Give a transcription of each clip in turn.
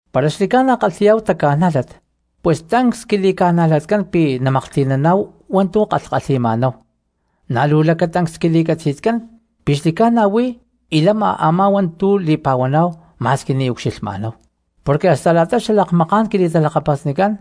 Para xli̠ca̠na kalhi̠yá̠hu taca̠nájlat pus tancs quili̠ca̠najlatcán pi̠ namaklhti̠naná̠hu hua̠ntu̠ kalhkalhi̠ma̠náhu; na̠ luu lacatancs quili̠catzi̠tcán pi̠ xli̠ca̠na huí y lama a̠má hua̠ntu̠ li̠pa̠huaná̠hu ma̠squi ni̠ ucxilhma̠náhu. Porque hasta xalakmaká̠n quili̠talakapasnicán,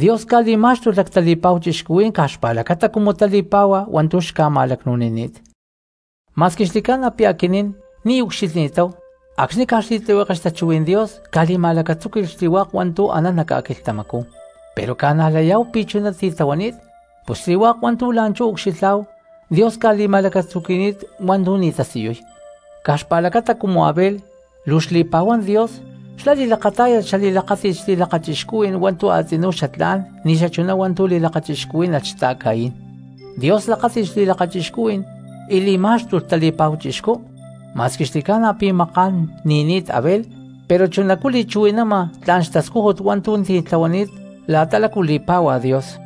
Dios ca̠li̠má̠xtulh lactali̠pa̠hu cristianos caj xpa̠lacata cumu tali̠páhua hua̠ntu̠ xca̠ma̠lacnu̠nini̠t. Ma̠squi xli̠ca̠na pi̠ aquinín ni̠ ucxilhni̠táhu acxni̠ caj xli̠tlihueke xtachuhuí̠n Dios ca̠li̠ma̠lacatzúqui̠lh xli̠hua̠k hua̠ntu̠ anán nac ca̠quilhtamacú, pero ca̠najlayá̠hu pi̠ chuná titlahuani̠t. Pus xli̠hua̠k hua̠ntu̠ la̠nchú ucxilhá̠hu Dios ca̠li̠ma̠lacatzuqui̠ni̠t hua̠ntu̠ ni̠ tasiyuy. Caj xpa̠lacata cumu Abel luu xli̠pa̠huán Dios xlá li̠lakatá̠yalh xatamaakxtakajní̠n xli̠lakachixcuhuí̠n hua̠ntu̠ a̠tzinú xatlá̠n ni̠ xachuná hua̠ntu̠ li̠lakachixcuhuí̠nalh xta̠Caín, Dios lakáti̠lh xli̠lakachixcuhui̠n y li̠má̠xtulh tali̠pa̠hu chixcú. Ma̠squi xli̠ca̠na pi̠ maká̠n ni̠ni̠t Abel pero chunacú li̠chuhui̠nama tla̠n xtascújut hua̠ntu̠ titlahuani̠t la̠ta lácu li̠pá̠hua Dios.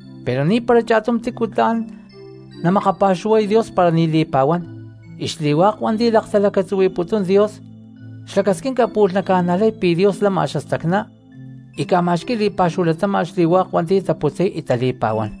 Pero ni̠para cha̠tum tícu tla̠n namakapa̠xuhuay Dios para ni̠ li̠pa̠huán, y xli̠hua̠k hua̠nti̠ laktalacatzuhui̠putún Dios, xlacasquinca pu̠lh naca̠najlay pi̠ Dios lama xastacná y ca̠ma̠xqui̠y li̠pa̠xúhu latáma̠t xli̠hua̠k hua̠nti̠ taputzay y tali̠pa̠huán.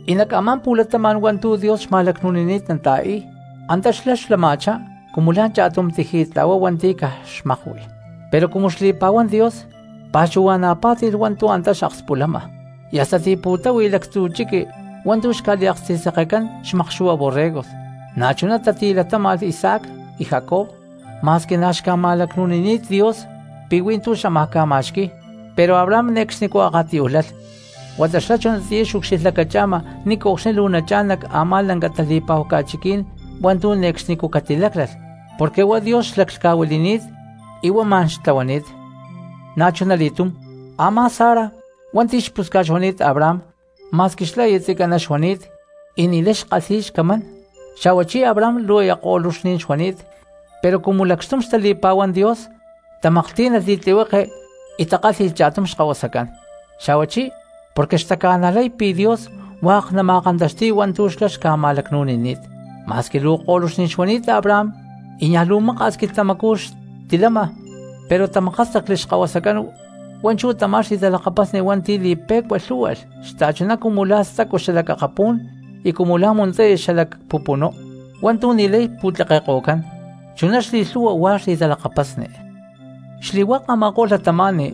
Y nac a̠má pu̠latama̠n hua̠ntu̠ Dios xma̠lacnu̠nini̠t nata̠i̠y antá xlá xlama̠chá cumu la̠ cha̠tum tiji̠tla̠hua hua̠nti̠ caj xmakui. Pero cumu xli̠pa̠huán Dios pa̠xuhua̠na̠ pá̠ti̠lh hua̠ntu̠ antá xakspulama, y hasta tipu̠táhui lactzu̠ chiqui hua̠ntu̠ xca̠liaksti̠sekecán xmakxu̠hua borregos; na̠chuná tatilatáma̠lh Isaac y Jacob ma̠squi na̠ xca̠ma̠lacnu̠nini̠t Dios pi̠ hui̠ntú xámaj ca̠ma̠xqui̠y. Pero Abraham ne̠cxnicú akatiyúj lalh huata xlá chunatiyá xucxilhlacacha̠ma ni̠nco̠cxni luu nachá̠n nac a̠má lanca tali̠pa̠hu ca̠chiquí̠n hua̠ntu̠ ne̠cxnicú catiláclalh porque huá Dios xlaclhca̠huili̠ni̠t y huá ma̠n xtlahuani̠t. Na̠chunali̠túm a̠má Sara hua̠nti̠ xpusca̠t xuani̠t Abraham ma̠squi xlá aya tzicaná xuani̠t y ni̠lay xkalhi̠y xcamán, xa̠huachí Abraham luu aya ko̠luxní̠n xuani̠t, pero cumu lacxtum xtali̠pa̠huán Dios tamaklhtí̠nalh li̠tlihueke y takálhi̠lh cha̠tum xkahuasacán, xa̠huachí porque xtaca̠najlay pi̠ Dios hua̠k nama̠kantaxti̠y hua̠ntu̠ xlá xca̠ma̠lacnu̠nini̠t. Ma̠squi luu ko̠luxní̠n xuani̠t Abraham y niaj luu maka̠s quilhtamacú xtilama pero tamakástacli xkahuasacán hua̠nchú tamá xli̠talakapasni hua̠nti̠ li̠pe̠cua lhú̠hualh xta̠chuná cumu lá stacu xalac akapú̠n y cumu la̠ muntzaya xalac pupunú hua̠ntu̠ ni̠lay pu̠tlekeko̠cán, chuná xli̠lhu̠hua huá xli̠talakapasni. Xli̠hua̠k a̠ma̠ko̠lh cristianos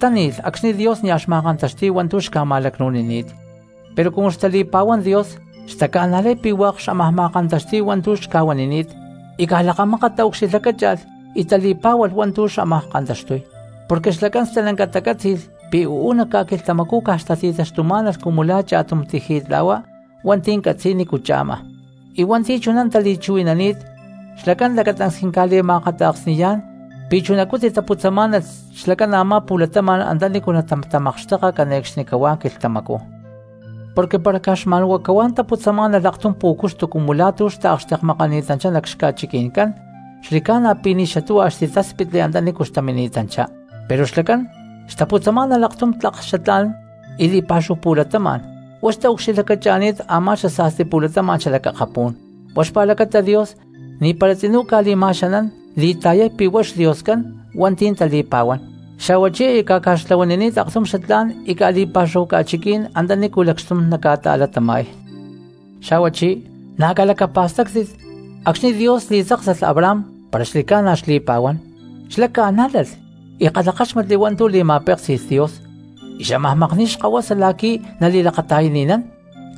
táni̠lh acxni̠ Dios nia̠ xma̠kantaxti̠y hua̠ntu̠ xca̠ma̠lacnu̠nini̠t; pero cumu xtali̠pa̠huán Dios xtaca̠najlay pi̠ hua̠k xámaj ma̠kantaxti̠y hua̠ntu̠ xca̠huanini̠t, y caj lakamákat taucxilhlacácha̠lh y tali̠pa̠xúhualh hua̠ntu̠ xámaj kantaxtuy, porque xlacán stalanca tacátzi̠lh pi̠ uú nac ca̠quilhtamacú caj xtati̠taxtumá̠nalh cumu la̠ cha̠tum tiji̠tla̠hua hua̠nti̠ catzi̠y nícu cha̠ma. Y hua̠nti̠ chuná tali̠chuhui̠nani̠t xlacán lacatancs quinca̠li̠ma̠akata̠ksni̠yá̠n pi̠ chunacú titaputzamá̠nalh xlacán a̠má pu̠latama̠n antanícu natatamakxteka cane̠cxnicahuá quilhtamacú. Porque para caj xma̠n huá cahuá taputzamá̠nalh aktum pú̠cuxtu cumu la̠ tu̠ xtaakxtekmakani̠tanchá nac xca̠chiqui̠ncán xli̠ca̠na pi̠ ni̠ xatuhua xtitatáspitli antanícu xtamini̠tanchá, pero xlacán xtaputzamá̠nalh aktum tlak xatlá̠n y li̠pa̠xúhu pu̠latama̠n, huá xtaucxilhlacacha̠ni̠t a̠má xasa̠sti pu̠latama̠n xalac akapú̠n. Huá xpa̠lacata Dios ni̠para tzinú ca̠li̠ma̠xanán li̠ta̠yay pi̠ huá xDioscán hua̠nti̠ tali̠pa̠huán, xa̠huachí aya ca̠ca̠xtlahuanini̠t aktum xatlá̠n y ca̠li̠pa̠xúhu ca̠chiquí̠n antanícu lacxtum naca̠ta̠latama̠y. Xa̠huachí na̠ calacapa̠stáctit, acxni̠ Dios li̠tzáksalh Abraham para xli̠ca̠na xli̠pa̠huán xlá ca̠nájlalh y kalhakáxmatli hua̠ntu̠ li̠ma̠péksi̠lh Dios y xámaj makni̠y xkahuasa la̠qui̠ nali̠lakata̠yani̠nán;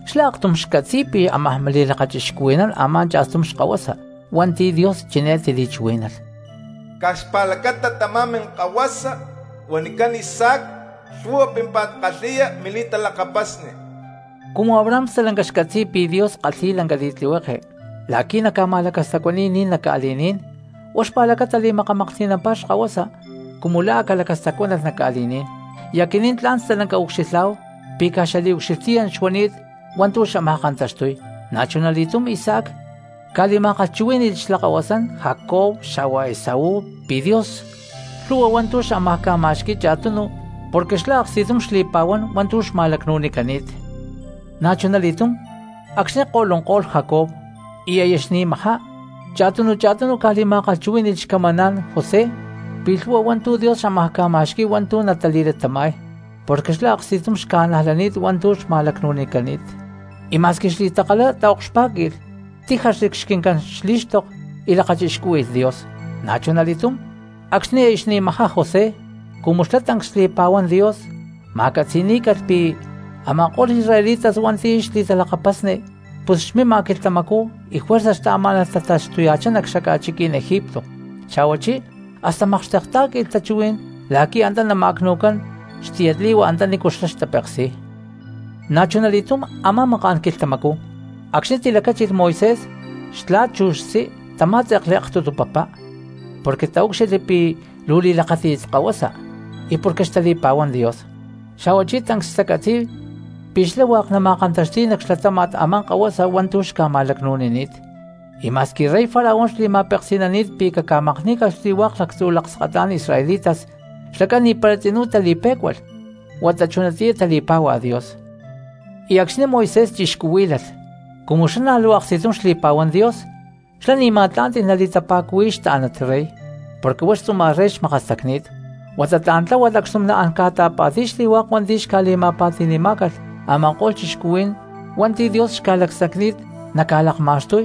xlá aktum xcatzi̠y pi̠ ámaj li̠lakachixcuhui̠nán a̠má cha̠stum xkahuasa hua̠nti̠ Dios chiné tili̠chuhuí̠nalh: “Caj xpa̠lacata tamá minkahuasa huanicán Isaac lhu̠hua pímpa̠t kalhi̠ya mili̠taxtlalakapasni.” Chuná huama porque Abraham stalanca xcatzi̠y pi̠ Dios kalhi̠y lanca li̠tlihueke la̠qui̠ nama̠lacastacuani̠y ni̠n nac ca̠li̠ní̠n, huá xpa̠lacata li̠makamaklhti̠nampá xkahuasa cumu lá a̠ calacastacuánalh nac ca̠li̠ní̠n, y aquinín tla̠n stalanca ucxilhá̠hu pi̠ caj xaliucxilhtiyán xuani̠t hua̠ntu̠ xámaj kantaxtuy. Na̠chunali̠túm Isaac ca̠li̠ma̠kalhchuhuí̠ni̠lh xlakahuasán Jacob xa̠hua Esaú pi̠ Dios lhu̠hua hua̠ntu̠ xámaj ca̠ma̠xqui̠y cha̠tunu porque xlá aksti̠tum xli̠pa̠huán hua̠ntu̠ xma̠lacnu̠nicani̠t. Na̠chunali̠túm acxni̠ ko̠lunko̠lh Jacob y aya xni̠majá cha̠tunu cha̠tunu ca̠li̠ma̠kalhchuhuí̠ni̠lh xcamaná̠n José pi̠ lhu̠hua hua̠ntu̠ Dios xámaj ca̠ma̠xqui̠y hua̠ntu̠ natali̠latama̠y, porque xlá aksti̠tum xca̠najlani̠t hua̠ntu̠ xma̠lacnu̠nicani̠t, y ma̠squi xli̠takalá taokxpá̠qui̠lh tíjaxli xquincán xlí̠xtok y lakachixcúhui̠lh Dios. Na̠chunali̠túm acxni̠ aya xni̠majá José cumu xlá tancs xli̠pa̠huán Dios ma̠catzi̠ní̠calh pi̠ a̠ma̠ko̠lh israelitas hua̠nti̠ xlá xli̠talakapasni, pus xmima quilhtamacú y juerza xtaamá̠nalh tataxtuya̠chá nac xaca̠chiquí̠n Egipto, xa̠huachí hasta makxtektá̠qui̠lh tachuhuí̠n la̠qui̠ antá nama̠cnu̠cán xtiyatli̠hua antanícu xlá xtapeksi̠y. Na̠chunali̠túm a̠má maká̠n quilhtamacú acxni̠ tilacáchilh Moisés, xtla̠t chu xtzí tamá̠tze̠kli aktutu papá porque taúcxilhli pi̠ luu li̠lakáti̠t kahuasa y porque xtali̠pa̠huán Dios, xa̠huachí tancs xtacatzi̠y pi̠ xlá hua̠k natama̠kantaxti̠y nac xlatáma̠t a̠má kahuasa hua̠ntu̠ xca̠ma̠lacnu̠nini̠t, y ma̠squi rey Faraón xli̠ma̠peksi̠nani̠t pi̠ caca̠makní̠calh xli̠hua̠k lactzu̠ lakskatá̠n israelitas, xlacán ni̠para tzinú tali̠pé̠cualh huata chunatiyá tali̠páhua Dios. Xa̠huachí acxni̠ Moisés chixcuhuílalh cumu xlá na̠ luu aksti̠tum xli̠pa̠huán Dios xlá ni̠ ma̠tlá̠nti̠lh nali̠tapa̠cuhuiy xtá̠nat rey, porque huá xtzuma̠t rey xmakastacni̠t, huata tla̠n tláhualh acxtum naán ca̠ta̠pa̠ti̠y xli̠hua̠k hua̠ntu̠ xca̠li̠ma̠pa̠ti̠ni̠cán a̠ma̠ko̠lh cristianos hua̠nti̠ Dios xca̠lacsacni̠t naca̠lakma̠xtuy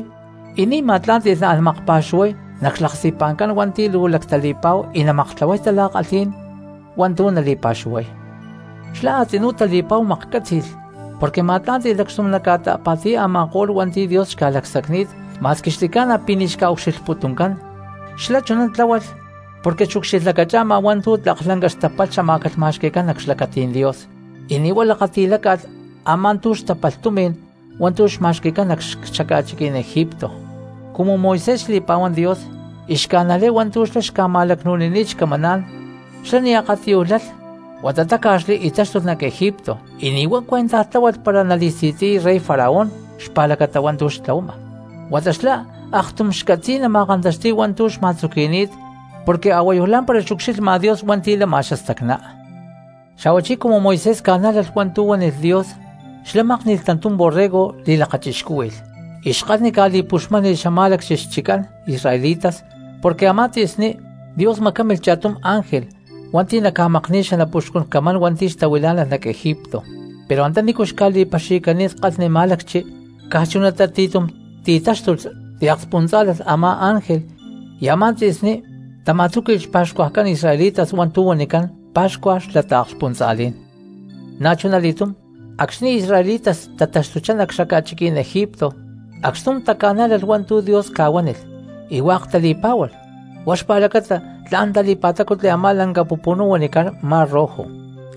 y ni̠ ma̠tlá̠nti̠lh naán makpa̠xuhuay nac xlaksti̠pa̠ncán hua̠nti̠ luu lactali̠pa̠hu y na̠ namaktlahuay tala̠kalhí̠n hua̠ntu̠ nali̠pa̠xuhuay. Xlá a̠tzinú tali̠pa̠hu maklhcátzi̠lh porque ma̠tlá̠nti̠lh lacxtum naca̠ta̠pa̠ti̠y a̠ma̠ko̠lh hua̠nti̠ Dios xca̠lacsacni̠t ma̠squi xli̠ca̠na pi̠ ni̠ xca̠ucxilhputuncán, xlá chuná tláhualh porque xucxilhlacacha̠ma hua̠ntu̠ tlak lanca xtapalh xamá̠calh ma̠xqui̠cán nac xlacatí̠n Dios y ni̠ huá lakati̠láca̠lh a̠má tú xtapalh tumi̠n hua̠ntu̠ xma̠xqui̠cán nac xaca̠chiquí̠n Egipto. Cumu Moisés xli̠pa̠huán Dios y xca̠najlay hua̠ntu̠ xlá xca̠ma̠lacnu̠nini̠t xcamaná̠n, xlá ni̠ akatiyuj lalh huata táca̠xli y táxtulh nac Egipto y ni̠ huá cuentaj tláhualh para nali̠si̠tzi̠y rey Faraón xpa̠lacata hua̠ntu̠ xtlahuama, huata xlá aktum xcatzi̠y nama̠kantaxti̠y hua̠ntu̠ xma̠tzuqui̠ni̠t, porque a̠huayu lá̠mpara xucxilhma Dios hua̠nti̠ lama xastacná. Xa̠huachí cumu Moisés ca̠nájlalh hua̠ntu̠ huánilh Dios xlá mákni̠lh tantum borrego li̠lakachixcúhui̠lh y xkalhni ca̠li̠puxmáni̠lh xamá̠lacchi xchiccán israelitas, porque a̠má tzi̠sní Dios macámilh cha̠tum ángel hua̠nti̠ naca̠makni̠y xanapuxcun camán hua̠nti̠ xtahuilá̠nalh nac Egipto, pero antanícu xca̠li̠paxi̠cani̠t kalhni má̠lacchi caj chunatá ti̠tum ti̠táxtulh ti̠akspuntza̠lalh a̠má ángel, y a̠má tzi̠sní tama̠tzúqui̠lh xpa̠xcuajcán israelitas hua̠ntu̠ huanicán pa̠xcua xla taakskspuntza̠lí̠n. Na̠chunali̠túm acxni̠ israelitas tataxtuchá nac xaca̠chiquí̠n Egipto acxtum taca̠nájlalh hua̠ntu̠ Dios ca̠huánilh y hua̠k tali̠pá̠hualh, huá xpa̠lacata tla̠n tali̠pa̠tácutli a̠má lanca pupunú huanicán Mar Rojo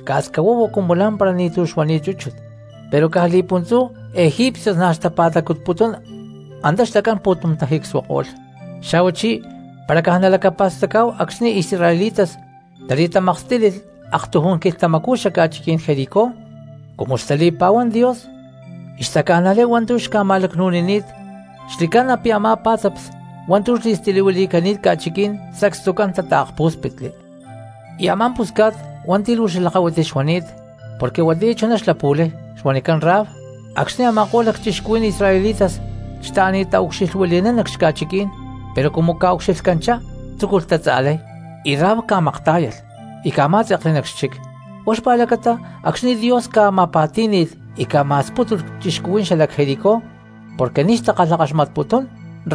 ca̠scahuahua cumu lá̠mpara ni̠tu̠ xuani̠t chúchut, pero caj li̠puntzú egipcios na̠ xtapa̠tacutputún antá xlacán pu̠tum tajicsuako̠lh. Xa̠huachí para caj nalacapa̠stacá̠hu acxni̠ israelitas tali̠tamakstílilh aktujún quilhtamacú xaca̠chiquí̠n Jericó, cumu xtali̠pa̠huán Dios y xtaca̠najlay hua̠ntu̠ xca̠ma̠lacnu̠nini̠t xli̠ca̠na pi̠ a̠má pá̠tzaps hua̠ntu̠ xli̠stilihuili̠cani̠t ca̠chiquí̠n sacstucán tata̠kpú̠spitli. Y a̠má pusca̠t hua̠nti̠ luu xalakahuiti xuani̠t porque huatiyá chuná xlapu̠lay xuanicán Rahab, acxni̠ a̠ma̠ko̠lh lacchixcuhuí̠n israelitas xtaani̠t taucxilhuili̠nán nac xca̠chiquí̠n, pero cumu ca̠ucxilhcanchá tzúculh tatza̠lay y Rahab ca̠maktá̠yalh y ca̠má̠tze̠kli nac xchic; huá xpa̠lacata acxni̠ Dios ca̠ma̠pa̠tí̠ni̠lh y ca̠ma̠spútulh cristianos xalac Jericó porque ni̠ xtakalhakaxmatputún,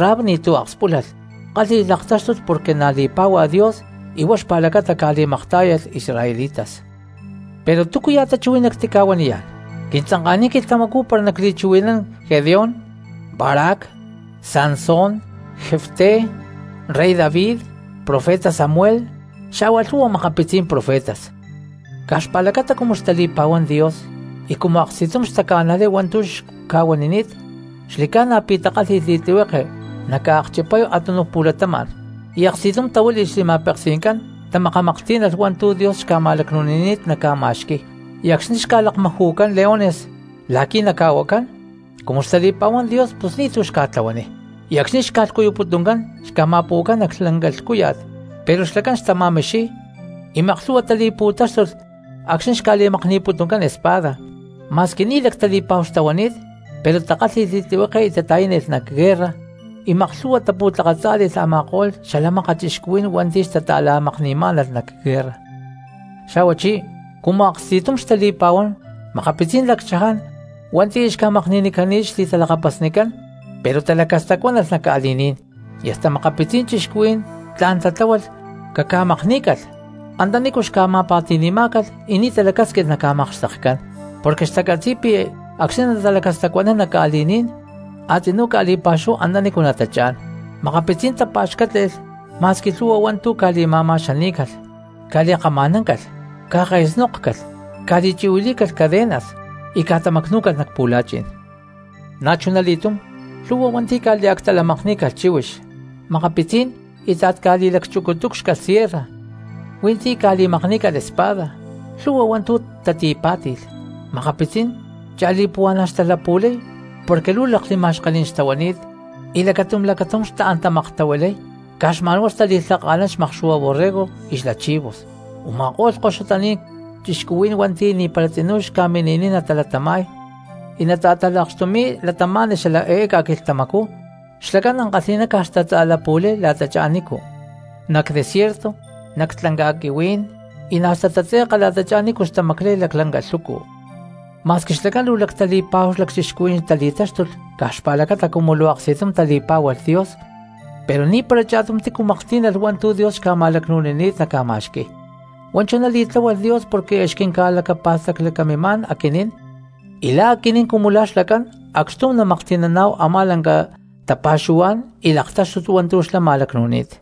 Rahab ni̠tu̠ akspúlalh kálhi̠lh laktáxtut porque na̠ li̠pá̠hua Dios y huá xpa̠lacata ca̠li̠maktá̠yalh israelitas. Pero ¿túcuajya̠ tachuhuí̠n nactica̠huaniyá̠n? Quintzanka̠niy quilhtamacú para nacli̠chuhui̠nán Gedeón, Barac, Sansón, Jefté, rey David, profeta Samuel, xa̠hua lhu̠hua makapitzí̠n profetas. Caj xpa̠lacata cumu xtali̠pa̠huán Dios y cumu aksti̠tum xtaca̠najlay hua̠ntu̠ xca̠huanini̠t xli̠ca̠na pi̠ takálhi̠lh li̠tlihueke nataakchipay a̠túnuj pu̠latama̠n, y aksti̠tum tahuíli̠lh xli̠ma̠peksi̠ncán, tamakamaklhtí̠nalh hua̠ntu̠ Dios xca̠ma̠lacnu̠nini̠t naca̠ma̠xqui̠y, y acxni̠ xca̠lakmaju̠cán leones la̠qui̠ naca̠huacán, cumu xtali̠pa̠huán Dios pus ni̠tu̠ xca̠tlahuaniy. Y acxni̠ xca̠lhcuyuputuncán xca̠tamacpu̠cán nac lanca lhcúya̠t, pero xlacán xtama̠mixiy, y maklhu̠hua tali̠pu̠táxtulh acxni̠ xca̠li̠makni̠putuncán espada, ma̠squi ni̠ lactali̠pa̠hu xtahuani̠t pero takálhi̠lh li̠tlihueke y tata̠yánilh nac guerra y maklhu̠hua tapu̠tlakatzá̠li̠lh a̠ma̠ko̠lh xala mákat cristianos hua̠nti̠ xtata̠la̠makni̠má̠nalh nac guerra. Xa̠huachí cumu aksti̠tum xtali̠pa̠huán makapitzí̠n lacchaján hua̠nti̠ aya xca̠makni̠nicani̠t xli̠talakapasnicán pero talacastacuánalh nac ca̠li̠ní̠n. Y hasta makapitzí̠n cristianos tla̠n tatláhualh caca̠makní̠calh antanícu xca̠ma̠pa̠ti̠ni̠má̠calh y ni̠ talacásquilh naca̠makxtekcán, porque xtacatzi̠y pi̠ acxni̠ natalacastacuanán nac ca̠li̠ní̠n a̠tzinú ca̠li̠pa̠xúhu antanícu natachá̠n. Makapitzí̠n tapa̠xcátle̠lh ma̠squi lhu̠hua hua̠ntu̠ cali̠ma̠ma̠xaní̠calh, cali̠kama̠náncalh, cake̠snókcalh, cali̠chi̠huilí̠calh cadenas y catamacnú̠calh nac pu̠la̠chi̠n. Na̠chunali̠túm lhu̠hua hua̠nti̠ ca̠liactalamakní̠calh chíhuix, makapitzí̠n íta̠t ca̠li̠lacchucutúcxcalh sierra, hui̠ntí ca̠li̠makní̠calh espada, lhu̠hua hua̠ntu̠ tatipá̠ti̠lh; makapitzí̠n cha̠li̠puhua̠na̠ xtalapu̠lay porque luu lakli̠ma̠xkení̠n xtahuani̠t y lacatum lacatum xtaán tamaktahuilay, caj xma̠n huá xtali̠lhaka̠nán xmakxu̠hua borrego y xla chivos. Uma̠kó̠lh koxutaní̠n cristianos hua̠nti̠ ni̠para tzinú xca̠mini̠niy natalatama̠y y natata̠talakxtumi̠y cristianos xala eé ca̠quilhtamacú, xlacán ankalhi̠ná caj xtatza̠lapu̠lay la̠tachá nícu, nac desierto, nac ca̠lanca̠quihuí̠n, y na̠ xtatatze̠ka la̠tachá nícu xtamaclay laclanca lhucu. Ma̠squi xlacán luu lactali̠pa̠hu lacchixcuhuí̠n tali̠táxtulh caj xpa̠lacata cumu luu aksti̠tum tali̠pá̠hualh Dios pero ni̠para cha̠tum tícu maklhtí̠nalh hua̠ntu̠ Dios xca̠ma̠lacnu̠nini̠t naca̠ma̠xqui̠y. Huá chuná li̠tláhualh Dios porque aya xquinca̠pa̠staclacamimá̠n aquinín, y la̠ aquinín cumu la̠ xlacán acxtum namaklhti̠naná̠hu a̠má lanca tapa̠xuhuá̠n y laktáxtut hua̠ntu̠ xlá ma̠lacnu̠ni̠t.